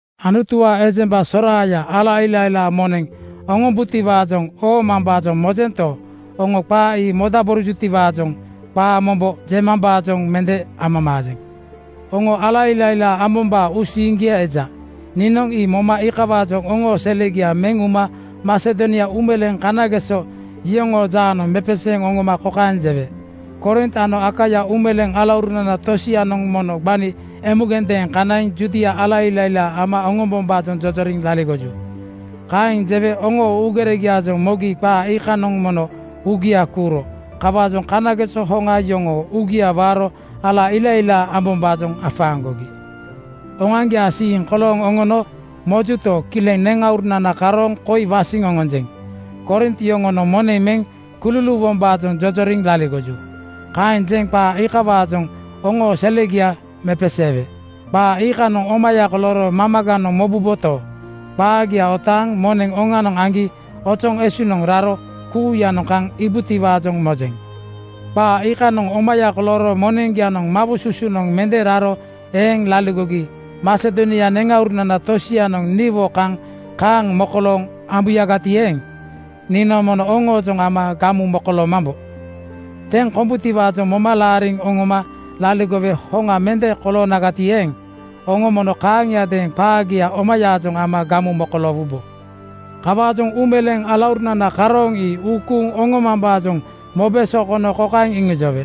Anutuwaa ejemba soraaya ala ilailaa moneŋ oŋombutiwaajoŋ oomambaajoŋ mojento, oŋo qaa ii modaborojutiwaajoŋ qaa mombo jemambaajoŋ mende amamaajeŋ. Oŋo ala ilailaa ambombaa uusiiŋgia eja. Niinoŋ ii moma iikawaajoŋ oŋoo selegia meŋ uma Masedonia uumeleeŋ kanageso yoŋoo jaanoŋ mepeseeŋ oŋoma kokaeŋ jewe, “Korint ano Akaia uumeleeŋ alaurunana tosianoŋ mono gbani emugendeeŋ kanaiŋ Judia ala ilailaa ama oŋombombaajoŋ jojoriŋ laligoju.” Kaeŋ jewe oŋoo uugeregiaajoŋ mogi qaa iikanoŋ mono uugia kuuro. Kawaajoŋ kanageso hoŋa yoŋoo uugia waaro ala ilailaa ambombaajoŋ afaaŋgogi. Oŋoaŋgiaa siiŋ kolooŋ oŋono mojuto, kileŋ neŋauruna karooŋ koi wasiŋ oŋonjeŋ. “Korint yoŋonoŋ moneŋ meŋ kululuuwombaajoŋ jojoriŋ laligoju,” kaeŋ jeŋ qaa iikawaajoŋ oŋoo selegia mepeseewe. Qaa iikanoŋ omaya kolooro mamaganoŋ mobuboto, qaagia otaaŋ moneŋ oŋanoŋ aŋgi ozoŋ esunoŋ raro kuuyanoŋ kaaŋ iŋiibutiwaajoŋ mojeŋ. Qaa iikanoŋ omaya kolooro moneŋgianoŋ mawosusunoŋ mende raro eeŋ laligogi Masedonia neŋauruna tosianoŋ niwo kaŋ kaaŋ mokolooŋ oŋombuyagati eeŋ, niinoŋ mono oŋoojoŋ ama gamu mokoloomambo. Teŋ kombutiwaajoŋ moma laariŋ oŋoma laligowe hoŋa mende koloonagati eeŋ, oŋo mono kaaŋiadeeŋ qaagia omayaajoŋ ama gamu mokoloowubo. Kawaajoŋ uumeleeŋ alaurunana karooŋ ii uu kuuŋ oŋomambaajoŋ mobe sokono kokaeŋ iŋijowe,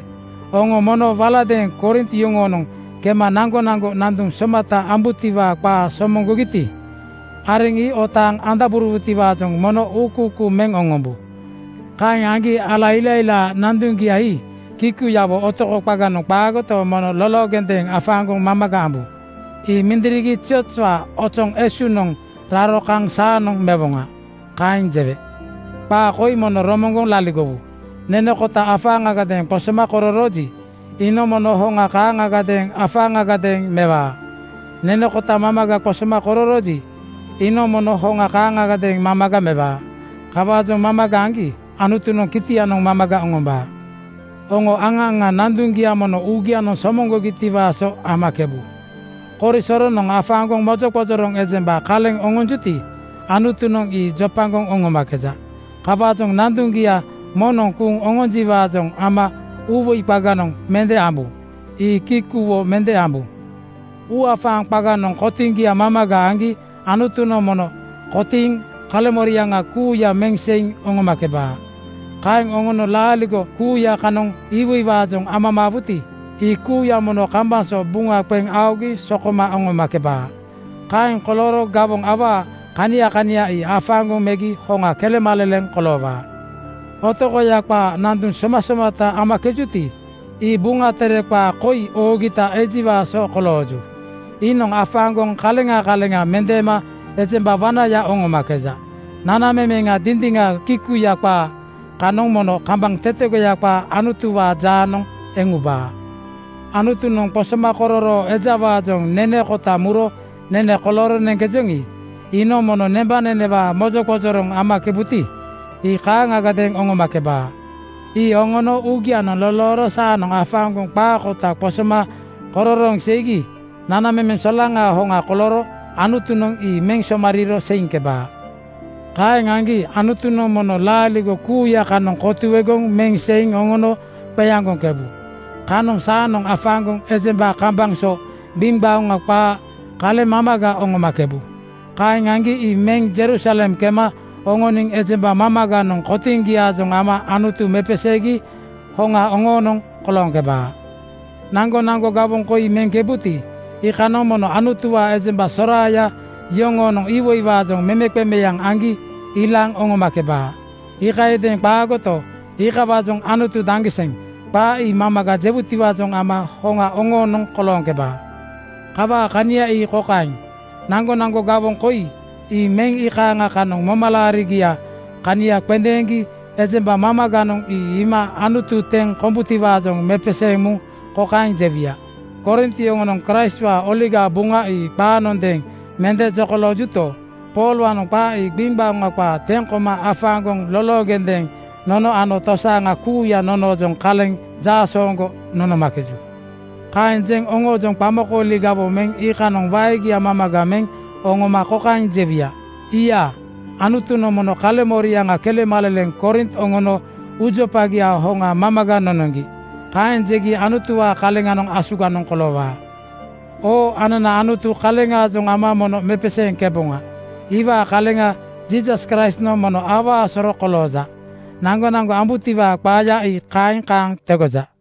“Oŋo mono waladeeŋ Korint yoŋoonoŋ kema naŋgonaŋgo nanduŋ somata ambutiwaa qaa somoŋgogiti, areŋ ii otaaŋ andaborowutiwaajoŋ mono uukuukuu meŋ oŋombu. Kaeŋ aŋgi ala ilailaa nanduŋgia ii kikuyawo otoko qaganoŋ qaagoto, mono loloogendeeŋ afaaŋgoŋ mamaga ambu. Ii mindirigi ziozwaa ozoŋ esunoŋ raro kaŋ saanoŋ mewoŋa.” Kaeŋ jewe. Qaa koi mono romoŋgoŋ laligowu: Nene kota afaaŋagadeeŋ qosoma kororooji, iinoŋ mono hoŋa kaaŋagadeeŋ afaaŋagadeeŋ mewaa. Nene kota mamaga qosoma kororooji, iinoŋ mono hoŋa kaaŋagadeeŋ mamaga mewaa. Kawaajoŋ mamaga aŋgi Anutunoŋ kitianoŋ mamaga oŋombaa. Oŋo aŋa aŋa nanduŋgia mono uugianoŋ somoŋgogitiwaa so amakebu. Korisoronoŋ afaaŋgoŋ mojoqojoroŋ ejemba kaleŋ oŋonjuti, Anutunoŋ ii jopagoŋ oŋomakeja. Kawaajoŋ nanduŋgia moŋnoŋ kuuŋ oŋonjiwaajoŋ ama uuwoi qaganoŋ mende ambu. Ii kikuwo mende ambu. Uuafaaŋ qaganoŋ kotiŋgia mamaga aŋgi Anutunoŋ mono kotiiŋ kaleŋmoriaŋa kuuya meŋ seiŋ oŋomakebaa. Kaeŋ oŋono laaligo kuuya kanoŋ iwoiwaajoŋ amamaawuti, ii kuuya mono kambaŋ so buŋa qeŋ aogi sokoma oŋomakebaa. Kaeŋ kolooro gawoŋ awaa kania kania ii afaaŋgoŋ megi hoŋa kelemaleleŋ koloowaa. Otokoya qaa nanduŋ somasomata amakejuti, ii Buŋa Tere qaa koi oogita ejiwaa so kolooju, “Iinoŋ afaaŋgoŋ kaleŋa kaleŋa mendeema ejemba wanaya oŋomakeja. Nanamemeŋa dindiŋa kikuya qaa kanoŋ mono kambaŋ tetegoya qaa Anutuwaa jaanoŋ eŋ ubaa.” Anutunoŋ qosomakororoo ejawaajoŋ nene kota muro nene kolooro neŋkejoŋi, iinoŋ mono nembanenewaa mojoqojoroŋ amakebuti, ii kaaŋagadeeŋ oŋomakebaa. Ii oŋono uugianoŋ lolooro saanoŋ afaaŋgoŋ qaa kota qosoma kororooŋ seigi nanamemeŋ solaŋaa hoŋa kolooro Anutunoŋ ii meŋ somariiro seiŋkebaa. Kaeŋ aŋgi Anutunoŋ mono laaligo kuuya kanoŋ kotuegoŋ meŋ seiŋ oŋono qeaŋgoŋkebu. Kanoŋ saanoŋ afaaŋgoŋ ejemba kambaŋ so gbiŋgbaoŋa qaa kaleŋ mamaga oŋomakebu. Kaeŋ aŋgi ii meŋ (Jerusalem kema) oŋoniŋ ejemba mamaganoŋ kotiŋgiaajoŋ ama Anutu mepeseegi hoŋa oŋoonoŋ kolooŋkebaa. Naŋgonaŋgo gawoŋ koi meŋkebuti, iikanoŋ mono Anutuwaa ejemba soraaya yoŋonoŋ iwoiwaajoŋ memeqemeaŋ aŋgi ilaaŋ oŋomakebaa. Iikayadeeŋ qaagoto, iikawaajoŋ “Anutu daŋgiseŋ!” qaa ii mamaga jewutiwaajoŋ ama hoŋa oŋoonoŋ kolooŋkebaa. Kawaa kania ii kokaeŋ: Naŋgonaŋgo gawoŋ koi meŋ iikaaŋa kanoŋ momalaarigiaa kania qendeeŋgi ejemba mamaganoŋ ii iima Anutu teŋ kombutiwaajoŋ mepeseeŋ muŋ kokaeŋ jewuya, “Korint yoŋonoŋ Kraistwaa Oligaa Buŋa ii qaanondeeŋ mende jokoloojuto, Poolwaanoŋ qaa ii gbiŋgbaoŋa qaa teŋ koma afaaŋgoŋ loloogendeeŋ nono ano tosaaŋa kuuya noŋoojoŋ kaleŋ jaasooŋgo nonomakeju.” Kaeŋ jeŋ oŋoojoŋ qamakooli gawoŋ meŋ iikanoŋ waegia mamaga meŋ oŋoma kokaeŋ jewuya, “Iiya! Anutunoŋ mono kaleŋmoriaŋa kelemaleleŋ Korint oŋono uujopagiaa hoŋa mamaga nonoŋgi.” Kaeŋ jegi Anutuwaa kaleŋanoŋ asuganoŋ koloowaa. Oo anana Anutu kaleŋaajoŋ ama mono mepeseeŋkeboŋa. Iwaa kaleŋa Jiisas Kraistnoŋ mono awaa soro kolooja. Naŋgonaŋgo ambutiwaa qaaya ii kaeŋ kaŋ tegoja.